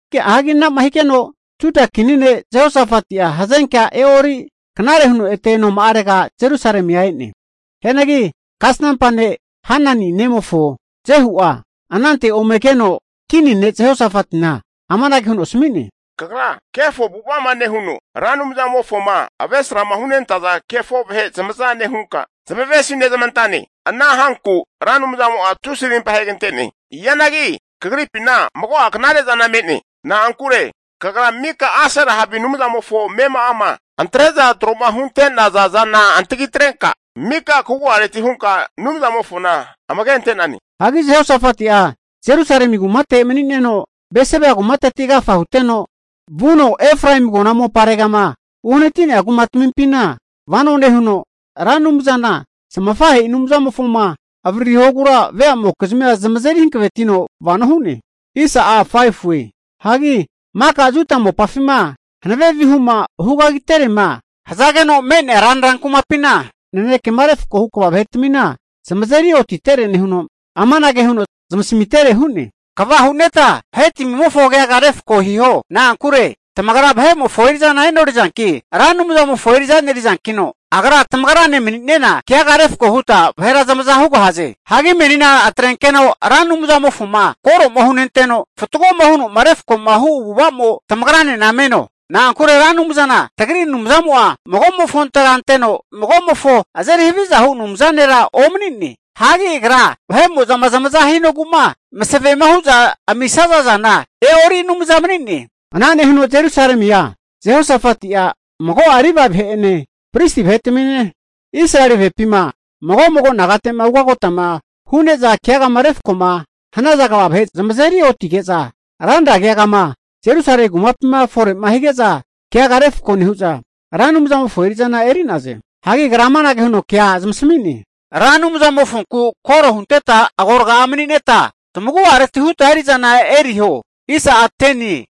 Hagi ana'ma higeno Juda kini ne' Jehosafati'a, hazenkea e'ori knare huno ete noma'arega Jerusalemia e'ne. Hianagi kasnampa ne' Hanani nemofo Jehu'a, anante ome keno kini ne' Jehosafatina amanage huno asmi'ne, Kagra kefo avu'ava'ma nehuno, Ra Anumzamofoma avresrama hunentaza kefo vahe zamaza nehunka kavesizmante'nane. Ana hanku Ra Anumzamo'a tusi rimpa ahegante'ne. Hianagi kagripina mago'a knare zana me'ne. Na'ankure kagra mika Asera havi anumzamofo amema'ama antre'za tro'ma hunte'nazana antagitrenka mika kagu'areti hunka Anumzamofona amage ante'nane. Hagi Jehosafati'a Jerusalemi kumate mani'neno, Beseba kumateti agafa huteno vuno Efraemi agona moparegama uhanati'nea kumatmimpina vano nehuno, Ra Anumzana zamafahe'i Anumzamofoma avararihogura veamokizmia zamazeri hankavetino vano hu'ne. Hagi maka Juda mopafima hanave vihuma hugagiterema hazageno me'nea ranra kumapina, nanekema refkoma hu kva vahetmina zamazeri otitere nehuno, amanage huno zamasmitere hu'ne, Kva hu'neta vahetmimofo keaga refko hiho. Na'ankure tamagra vahe'mofo eri'zana e'norizanki, Ra Anumzamofo eri'za e'nerizankino, Agra tamagrane mani'nena keaga refko huta vahera zamaza hugahaze. Hagi menina atrenkeno Ra Anumzamofoma koroma hunenteno fatgo huno'ma refkoma hu avu'avamo tamagranena meno. Na'ankure Ra Anumzana tagri Anumzamo'a magomofontega anteno, magomofo azeri havizahu Anumza nera omani'ne. Hagi Agra vahe'mo'zama zamaza hinogu'ma masavema hu'za amisaza zana e'ori Anumza mani'ne. Ana nehuno Jerusalemia Jehosafati'a mago'a Livae vahe'ene, pristi vahetamine, Israeli vahepima mago mago nagate'ma ugotama hu'ne'za keagama refkoma hanaza kva vahe zamazeri otige'za, ranra keagama Jerusalemi kumapima fore'ma hige'za keaga refko nehu'za, Ra Anumzamofo eri'zana eri'naze. Hagi agra amanage huno kea zamasmi'ne, Ra Anumzamofonku koro hunteta agorga'a mani'neta, tamagu'areti huta eri'zana eriho.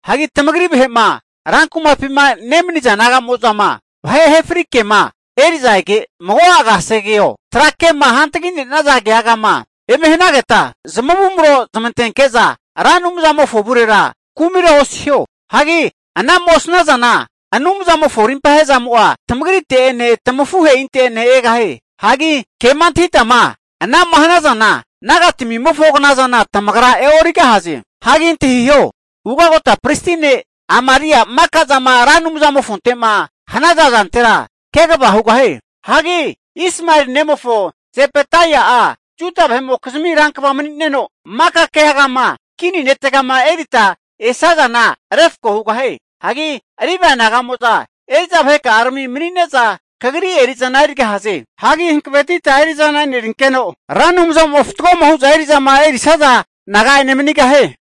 Hagi tamagri vahe'ma rankumapima nemaniza naga'mo'zama, vahe ahefri ke'ma eri'za ege, mago'a kasegeo, trake'ma hantagi'nenaza keagama eme hanageta, zamavumro zmantenke'za Ra Anumzamofo avurera kumira osiho. Hagi ana'ma osnazana Anumzamofo rimpahezamo'a tamagrite'ene tamafuhe'inte'ene egahie. Hagi kema antahitama ana'ma hanazana, nagatmimofo knazana tamagra e'origahaze. Hagi antahiho, ugagota pristi ne' Amaria'a maka zama Ra Anumzamofonte'ma hanaza zantera kegava hugahie. Hagi Ismaeli nemofo Zebadaia'a Juda vahe'mokizmi rankva mani'neno maka keagama kini netegama erita esazana refko hugahie. Hagi Livae naga'mo'za eri'za vaheka'arami mani'neza kagri eri'zana erigahaze. Hagi hankavetita eri'zana e'nerinkeno, Ra Anumzamo'a fatgoma hu'za eri'zama erisaza naga'ene manigahie.